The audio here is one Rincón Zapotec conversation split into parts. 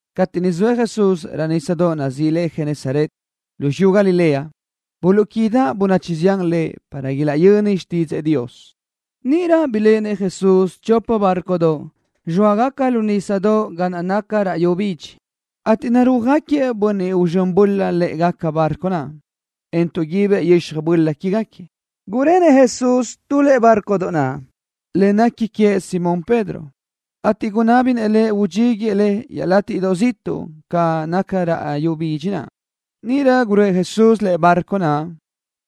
Cateʼ niʼ zoëʼ Jesús raʼ nísadoʼ nazíʼi le Genesaret, lu xiyú Galilea, buluʼquídaʼ bönachi zián Lëʼ para ilaʼyöni xtídzëʼë Dios. Níʼirö biléʼenëʼ Jesús chopa bárcodoʼ, zxóagaca lu nísadoʼ ga naʼ naca raʼ yu bidxi, ateʼ narúajgaquiëʼ bönniʼ uzxö́n böla lë́ʼegaca bárcodoʼ naʼ, en taʼguibëʼ yöxaj böla quégaquiëʼ. Gurenëʼ Jesús tu lëʼe bárcodoʼ naʼ, le nequi queëʼ Simón Pedro, ateʼ gunábinëʼ lëʼ udxíguiëʼ le iaʼlátiʼdoʼ ziʼtuʼ ga naca raʼ yu bidxi naʼ. Níʼirö guröʼë Jesús lëʼe bárcodoʼ naʼ,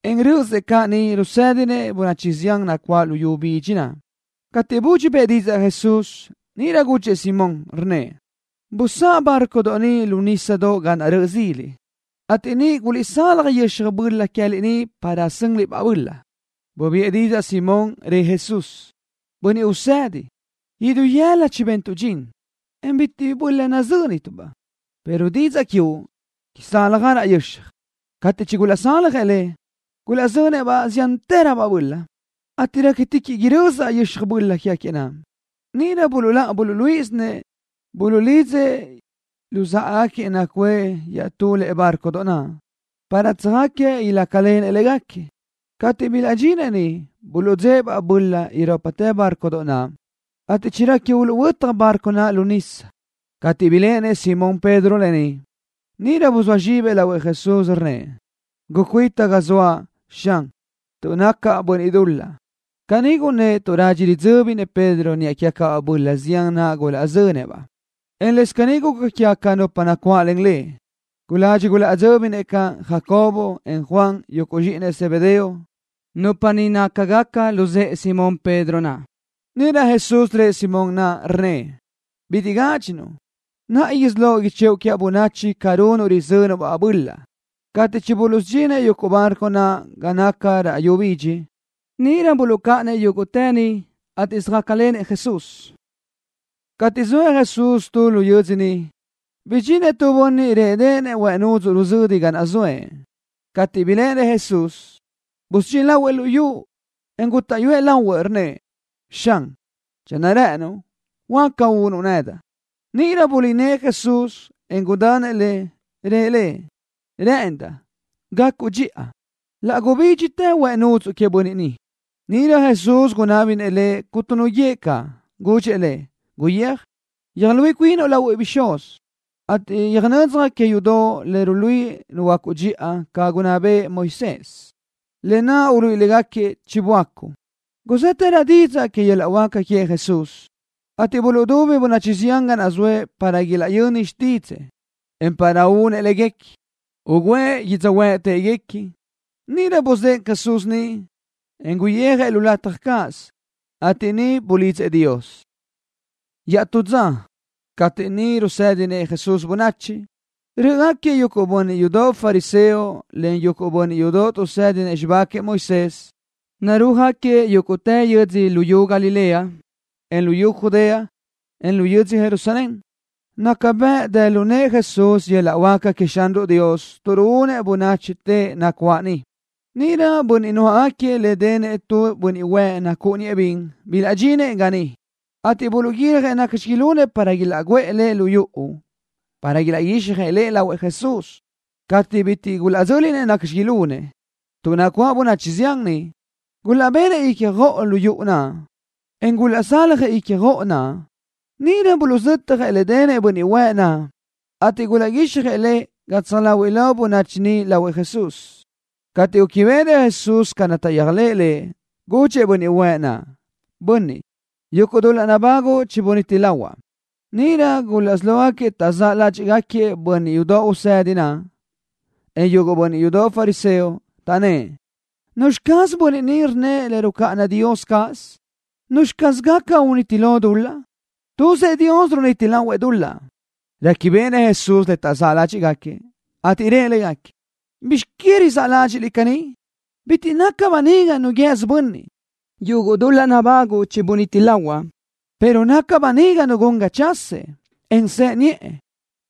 en rö́ʼösëʼ caʼ niʼ rusédinëʼ bönachi zián nacuáʼ lu yu bidxi naʼ. Cateʼ budxi bëʼë didzaʼ Jesús, níʼirö gudxëʼ Simón, rnnëʼ: —Busáʼ bárcodoʼ ni lu nísadoʼ ga naʼ röʼö zila, ateʼ niʼ guliʼzalaj yöxaj böla queë́liʼ para sönliʼ-baʼ böla. Bubiʼë didzaʼ Simón, rëʼ Jesús: —Bönniʼ Usëdi, idú yëla chibentuʼ dxin, en bitiʼ bi böla nazö́nituʼ-baʼ, pero didzaʼ quiuʼ izáljagaraʼ yöxaj. Cateʼ chigulaʼzaljëʼ le, gulaʼzönëʼ ziántëröbaʼ böla, ateʼ réquitiquiʼ irözaʼ yöxaj böla naʼ. Níʼirö buluʼláʼa buluʼluíʼisinëʼ, buluʼlidzëʼ luzáʼagaquiëʼ nacuʼë iaʼtú lëʼe bárcodoʼ naʼ para záʼgaquiëʼ ilácalenëʼ légaquiëʼ. Cateʼ bilaʼdxinëʼ niʼ buluʼdzë́ʼë-baʼ böla irópatë bárcodoʼ naʼ, ateʼ chirequi uluʼhuö́taj bárcodoʼ naʼ lu nisa. Cateʼ biléʼenëʼ Simón Pedro lë ni, níʼirö buzóa zxibëʼ lahuëʼ Jesús, rnnëʼ: —Gucuita ga zoaʼ, Xan, tuʼ nacaʼ bönniʼ dul-laʼ. Caní gunnë́ʼ tuʼ radxi ridzö́binëʼ Pedro niʼa quégacabaʼ böla zián naʼ gulaʼzö́ngaquiëʼ-baʼ, en lëscaʼ caní guca quégaca nupa nacuáʼlen lëʼ. Guladxi gulaʼdzö́binëʼ caʼ Jacobo, en Juan, yuguʼ zxíʼinëʼ Zebedeo, nupa ni nácagaca luzë́ʼë Simón Pedro naʼ. Níʼirö Jesús rëʼ Simón naʼ, rnnëʼ: —Bitiʼ gádxinuʼ. Naʼa isí loʼ ichëʼu quiaʼ bönachi ca runuʼ rizönuʼ-baʼ böla. Cateʼ chibuluʼsudxinëʼ yuguʼ bárcodoʼ naʼ ga naca raʼ yu bidxi, níʼirö buluʼcáʼanëʼ yúguʼtë niʼ, ateʼ söjácalenëʼ Jesús. Cateʼ zoëʼ Jesús tu lu yödzö niʼ, bidxinëʼ tu bönniʼ réʼedeʼenëʼ huëʼ nudzuʼ ruzödi ga naʼ zoëʼ. Cateʼ biléʼenëʼ Jesús, busudxín lahuëʼ lu yu, en gútaʼyuëʼ lahuëʼ, rnnëʼ: —Xan, channö rë́ʼënuʼ, huáca unuʼ nedaʼ. Níʼirö bulí nëʼë Jesús, en gudanëʼ lëʼ. Rëʼ lëʼ: —Rë́ʼëndaʼ. Gacuʼ dxiʼa. Laʼ gubídxitë huëʼ nudzuʼ queëʼ bönniʼ naʼ. Níʼirö Jesús gunná béʼenëʼ lëʼ cuntu nu guíëʼ caʼ. Gudxëʼ lëʼ: —Guyéaj, yöjluíʼi cuinuʼ lahuëʼ bixúz, ateʼ yöjnödzaj que yudoʼ le ruluíʼi nuhuöácuʼ dxiʼa ca gunná bëʼë Moisés, lë naʼ uluíʼi légaquiëʼ chiböácuʼ. Guzë́tërö didzaʼ que yöl-laʼ huáca queëʼ Jesús, ateʼ buluʼdubi bönachi zián ga naʼ zoëʼ para ilaʼyöni xtídzëʼë, en para únëʼ léguequi, ugǘëʼ yödzöhuë́ʼ téʼeguequi. Níʼirö buzë́ʼë Jesús niʼ, en guyijëʼ tu lataj cáʼasö, ateʼ niʼ bulidzëʼ Dios. Iaʼtú dza, cateʼ niʼ rusédinëʼ Jesús bönachi, rö́ʼögaquiëʼ yuguʼ bönniʼ yudoʼ fariseo len bönniʼ yudoʼ tuʼsédinëʼ xibá queëʼ Moisés niʼ, narúajgaquiëʼ yúguʼtë yödzö luyú Galilea, en luyú Judea, en lu yödzö Jerusalén. Naca bëʼ dë lu nëʼë Jesús yöl-laʼ huáca queëʼ Xanruʼ Dios tuʼ ruúnëʼ bönachi teʼe nacuáʼ niʼ. Níʼirö bönniʼ nuáʼagaquiëʼ le denëʼ tu bönniʼ huëʼ nacúʼuniëʼ bin bilaʼdxinëʼ ga niʼ, ateʼ buluʼguiljëʼ nacxi ilunëʼ para ilaʼguʼë lëʼ lu yuʼu para ilaʼguixjëʼ lëʼ lahuëʼ Jesús. Cateʼ bitiʼ gulaʼdzö́linëʼ nacxi ilunëʼ, tuʼ nacuáʼ bönachi zián niʼ, gulaʼbenëʼ ícjoʼolö yuʼu naʼ, en gulaʼsaljëʼ ícjoʼo naʼ. Níʼirö buluʼzötjëʼ le denëʼ bönniʼ huëʼ naʼ, ateʼ gulaʼguíxjëʼ lëʼ gatsaj láhuiʼlö bönachi niʼ lahuëʼ Jesús. Cateʼ gúquibeʼenëʼ Jesús ca naʼ taʼyéajlëʼë Lëʼ, gudxëʼ bönniʼ huëʼ naʼ: —Bönniʼ, yuguʼ dul-laʼ nabáguʼu chibuníti lahuaʼ. Níʼirö gulaʼsí lógaquiëʼ taʼzáʼ ládxiʼgaquiëʼ bönniʼ yudoʼ tuʼsédinëʼ naʼ, en yuguʼ bönniʼ yudoʼ fariseo, taʼnnë́ʼ: “¿Nuzxi caz bönniʼ ni rnnëʼ le rucáʼana Dios cáʼasö? ¿Nuzxi caz gaca uniti lo dul-laʼ? Tuzëʼ Dios runiti lahuëʼ dul-laʼ.” Réquibeʼenëʼ Jesús le taʼzáʼ ládxiʼgaquiëʼ, ateʼ rëʼ légaquiëʼ: —¿Bizx que rizáʼ ládxiʼliʼ caní? Bitiʼ naca böniga nu guië́sö bönniʼ ni: “Yuguʼ dul-laʼ nabáguʼu chibuníti lahuaʼ”, pero naca böniga nu gun ga chasëʼ, en sëʼe niʼë.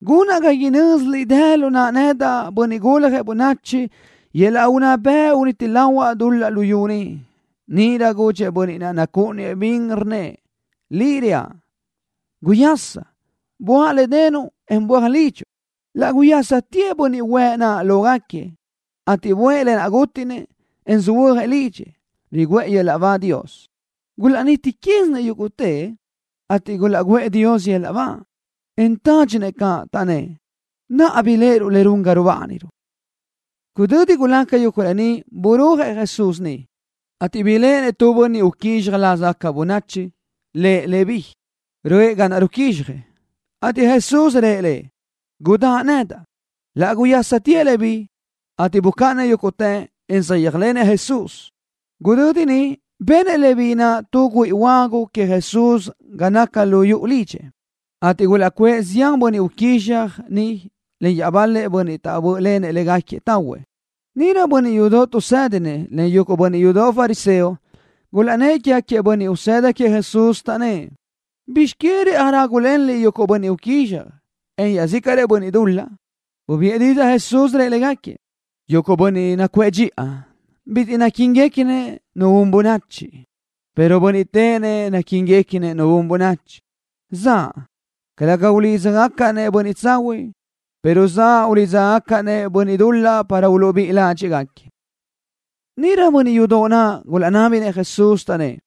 Gunaʼ ga inö́ziliʼ dë lu naʼa nedaʼ, Bönniʼ Guljëʼ Bönachi, yöl-laʼ unná bëʼ uniti lahuaʼ dul-laʼ luyú ni. Níʼirö gudxëʼ bönniʼ naʼ nacúʼuniëʼ bin, rnnëʼ: —Liʼ reaʼ, guyasa. Buáʼ le denuʼ, en böaj lidxuʼ. Laʼ guyásatëʼ bönniʼ huëʼ naʼ lógaquiëʼ, ateʼ buʼë lë naʼ gútiʼnëʼ, en söhuö́jëʼ lidxëʼ, riguʼë Dios yöl-laʼ ba. Gulaʼnítitiquiʼsinëʼ yúguʼtëʼ, ateʼ gulaʼguʼë Dios yöl-laʼ ba, en tádxisinëʼ caʼ, taʼnnë́ʼ: —Naʼa biléʼeruʼ le run ga rubániruʼ. Gudödi gulaca yuguʼ lë ni burúajëʼ Jesús niʼ, ateʼ biléʼenëʼ tu bönniʼ uquízxaj lázagaca bönachi, lëʼ Leví, röʼë ga naʼ ruquízxjëʼ, ateʼ Jesús rëʼ lëʼ: —Gudáʼ nedaʼ. Laʼ guyásatëʼ Leví, ateʼ bucáʼanëʼ yúguʼtë, en saʼyéajlenëʼ Jesús. Gudödi niʼ benëʼ Leví naʼ tu güíʼi huagu queëʼ Jesús ga naca lu yuʼu lidxëʼ, ateʼ gulaʼcuʼë zián bönniʼ uquízxaj niʼ len iaʼbal-lëʼ bönniʼ taʼbö́ʼlenëʼ légaquiëʼ tahuëʼ. Níʼirö bönniʼ yudoʼ tuʼsédinëʼ len yuguʼ bönniʼ yudoʼ fariseo gulaʼnnë́ʼ quégaquiëʼ bönniʼ usëda queëʼ Jesús, taʼnnë́ʼ: —¿Bizx que rëʼaj rágulenliʼ yuguʼ bönniʼ uquízxaj, en iaʼzícaʼrëʼ bönniʼ dul-laʼ? Bubiʼë didzaʼ Jesús, rëʼ légaquiëʼ: —Yuguʼ bönniʼ nacuʼë dxiʼa bitiʼ naquíniguequinëʼ nu un bönachi, pero bönniʼ téʼenëʼ naquíniguequinëʼ nu un bönachi. Zaʼa, calëga ulídzagacaʼ-nëʼ bönniʼ tsahuiʼ, pero zaʼa ulídzagacaʼ-nëʼ bönniʼ dul-laʼ para uluʼbíʼi ládxiʼgaquiëʼ. Níʼirö bönniʼ yudoʼ naʼ gulaʼnábinëʼ Jesús, taʼnnë́ʼ: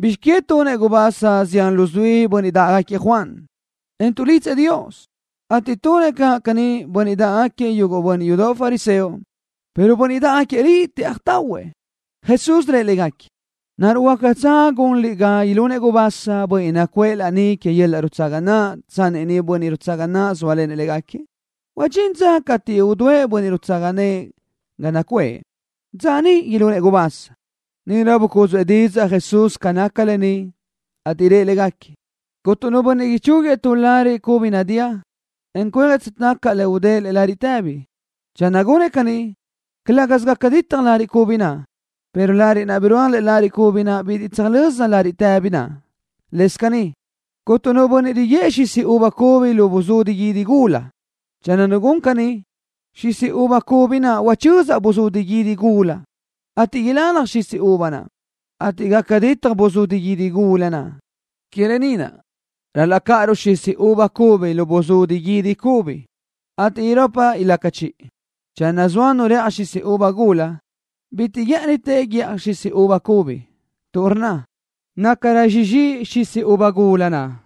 —¿Bizx que tunëʼ gubasa zián luzuí bönniʼ dáʼgaquiëʼ Juan, en tuʼlidzëʼ Dios, ateʼ tunëʼ caʼ caní bönniʼ dáʼgaquiëʼ yuguʼ bönniʼ yudoʼ fariseo, pero bönniʼ dáʼgaquiëʼ Liʼ tëʼaj tahuëʼ? Jesús rëʼ légaquiëʼ: —¿Naruʼ huácatsö gunliʼ ga ilunëʼ gubasa bönniʼ nacuʼë laní que yöl-laʼ rutsaga naʼ tsanni niʼ bönniʼ rutsaga nëʼë zóalenëʼ légaquiëʼ? Huadxín dza cateʼ udúëʼ bönniʼ rutsaga nëʼë ga nacuʼë. Dza níʼirö ilunëʼ gubasa. Níʼirö bucúdzuʼë didzaʼ Jesús ca naca lë ni, ateʼ rëʼ légaquiëʼ: —Cuntu nu bönniʼ ichúguiëʼ tu lariʼ cubi chinadía, en cuejëʼ tsötacaʼ le udë́ʼë lëʼe lariʼ tëbi. Channö gunëʼ caní, calë́gasö gaca ditaj lariʼ cubi naʼ, pero láriʼdoʼ naʼ birúaj lëʼe lariʼ cubi naʼ bitiʼ tsöjlö́za lariʼ tëbi naʼ. Lëscaʼ caní, cuntu nu bönniʼ riguë́ʼë xisi uva cubi lu buzudi guídi gula. Channö nu gun caní, xisi uva cubi naʼ uchözaʼ buzudi guídi gula, ateʼ ilalaj xisi uva naʼ, ateʼ gaca ditaj buzudi guídi gula naʼ. Que lë ni naʼ ral-laʼ cáʼaruʼ xisi uva cubi lu buzudi guídi cubi, ateʼ irópatë ilaca chiʼi. Channö zoa nu rëʼaj xisi uva gula, bitiʼ guë́ʼënitë guíʼaj xisi uva cubi, tuʼ rnna: “Nácarö sizxíʼ xisi uva gula naʼ.”